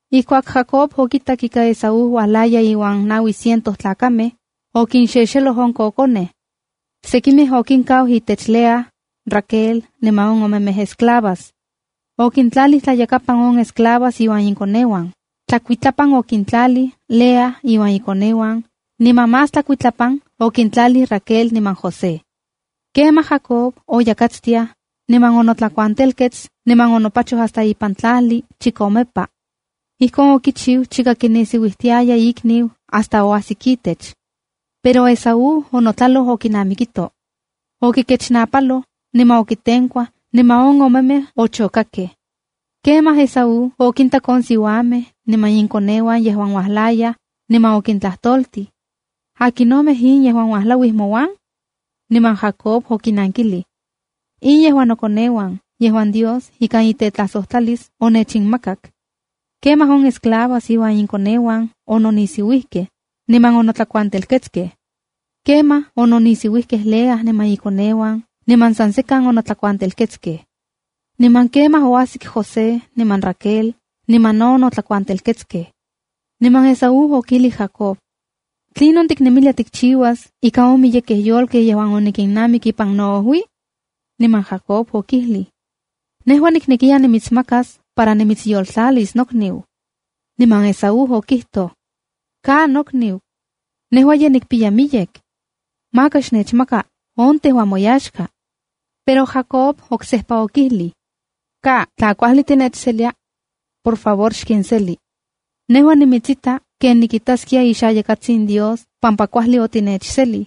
Ijkuak Jacob okitak ika Esaú uajlaya iuan naui ciento tlakamej, okinxexeloj on kokonej. Sekimej okinkau itech Lea, Raquel niman on omemej esclavas. Okintlalij tlayakapan on esclavas inuan inkoneuan, tlakuitlapan okitlalij Lea iuan ikoneuan, niman más tlakuitlapan okintlalij Raquel niman José. Kemaj Jacob oyakatstiaj, niman onotlakuantelkets niman onopachoj hasta ipan tlajli chikomepa. Ijkon okichiu chika kinisiuijtiaya ikniu hasta oajsik itech. Pero Esaú onotlaloj okinamikito. Okikechnapaloj, niman okitenkuaj, niman on omemej ochokakej. Kemaj Esaú okintak on siuamej niman inkoneuan yejuan ye uajlayaj, niman okitlajtoltij: —¿Akinomej in yejuan ualauij mouan? Niman Jacob okinankilij: —In nejua nokoneuan yejuan Dios ikan itetlajsotlalis onechinmakak. Kemaj on esclavas iuan inkoneuan ononisiuijkej, niman onotlakuantelketskej. Kemaj ononisiuijkej Lea niman ikoneuan niman san sekan onotlakuantelketskej. Niman kemaj oajsik José niman Raquel niman no onotlakuantelketskej. Niman Esaú okijlij Jacob: —¿Tlinon tiknemilia tikchiuas ika on miyekej yolkej yejuan onikinnamik ipan noojui? Niman Jacob okijlij: —Nejua niknekiya nimitsmakas para nimitsyoltlalis nokniu. Niman Esaú okijtoj: —Ka nokniu. Nejua ye nikpiya miyek. Maka xnechmaka on tejua moyaxka. Pero Jacob oksejpa okijlij: —¡Ka! Tla kuajli tinechselia, por favor xkinseli. Nejua nimitsita ken nikitaskia ixayakatsin Dios pampa kuajli otitechselij.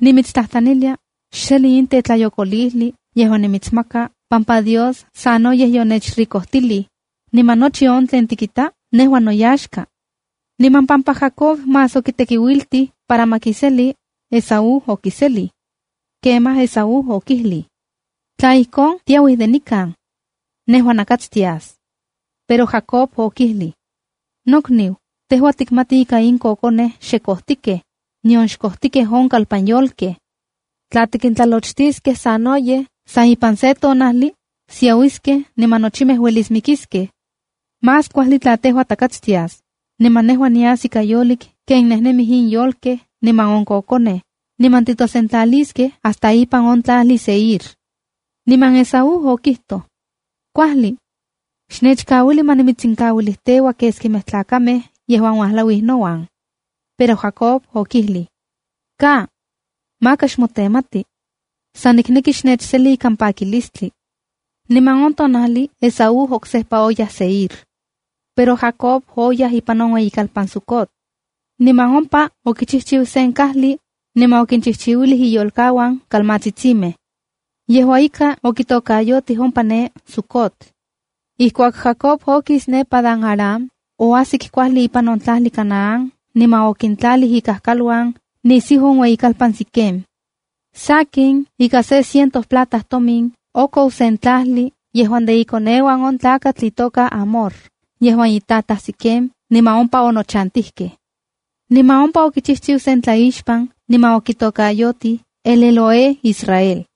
Nimitstlajtlanilia, xseli in tetlayokolijli yejuan nimitsmaka pampa Dios sanoyej yonechricojtilij, niman nochi on tlen tikita nejua noyaxka. Niman pampa Jacob más okitekiuiltij para ma kiseli, Esaú okiselij. Kemaj Esaú okijlij: —Tla ijkon, tiauij de nikan. Nejua nakatstias. Pero Jacob okijlij: —Nokniu, tejua tikmati ika in kokonej xe kojtikej, nion xkojtikej on kalpanyolkej. Tla tikintlalochtiskej sanoyej, san ipan se tonajli, siauiskej niman nochimej ueliskej mikiskej. Más kuajli para tejua takatstias, niman nejua nias ika yolik ken nejnemij in yolkej niman in kokonej, niman titosentlaliskej hasta ipan on tlajli Seir. Niman Esaú okijtoj: —¡Kuajli! Xnechkauili ma nimitsinkauilijteua keskimej tlakamej yejuan ualauij nouan. Pero Jacob okijlij: —¡Ka! Maka xmotenmati. San nikneki xnechseli ikan pakilistli. Niman on tonajli Esaú oksejpa oyaj Seir. Pero Jacob oyaj ipan on ueyikalpan Sucota. Niman ompa okichijchiu sen kajli, niman okinchijchiuilij iyolkauan kalmatsitsimej. Yejua ika, okitokayotij ompa ne, Sucot. Ijkuak Jacob okis ne Padan-aram, oajsik kuajli ipan on tlajli Canaán niman okintlalij ikaluan nisiu on ueyikalpan Siquem. Sakin, ika se ciento plata tomin, okou sen tlajli yejuan de ikoneuan on tlakatl Hamor yejuan itataj Siquem niman ompa onochatijkej. Niman ompa okichijchiu sen tlaixpan niman okitokayotij El-Elohe-Israelb.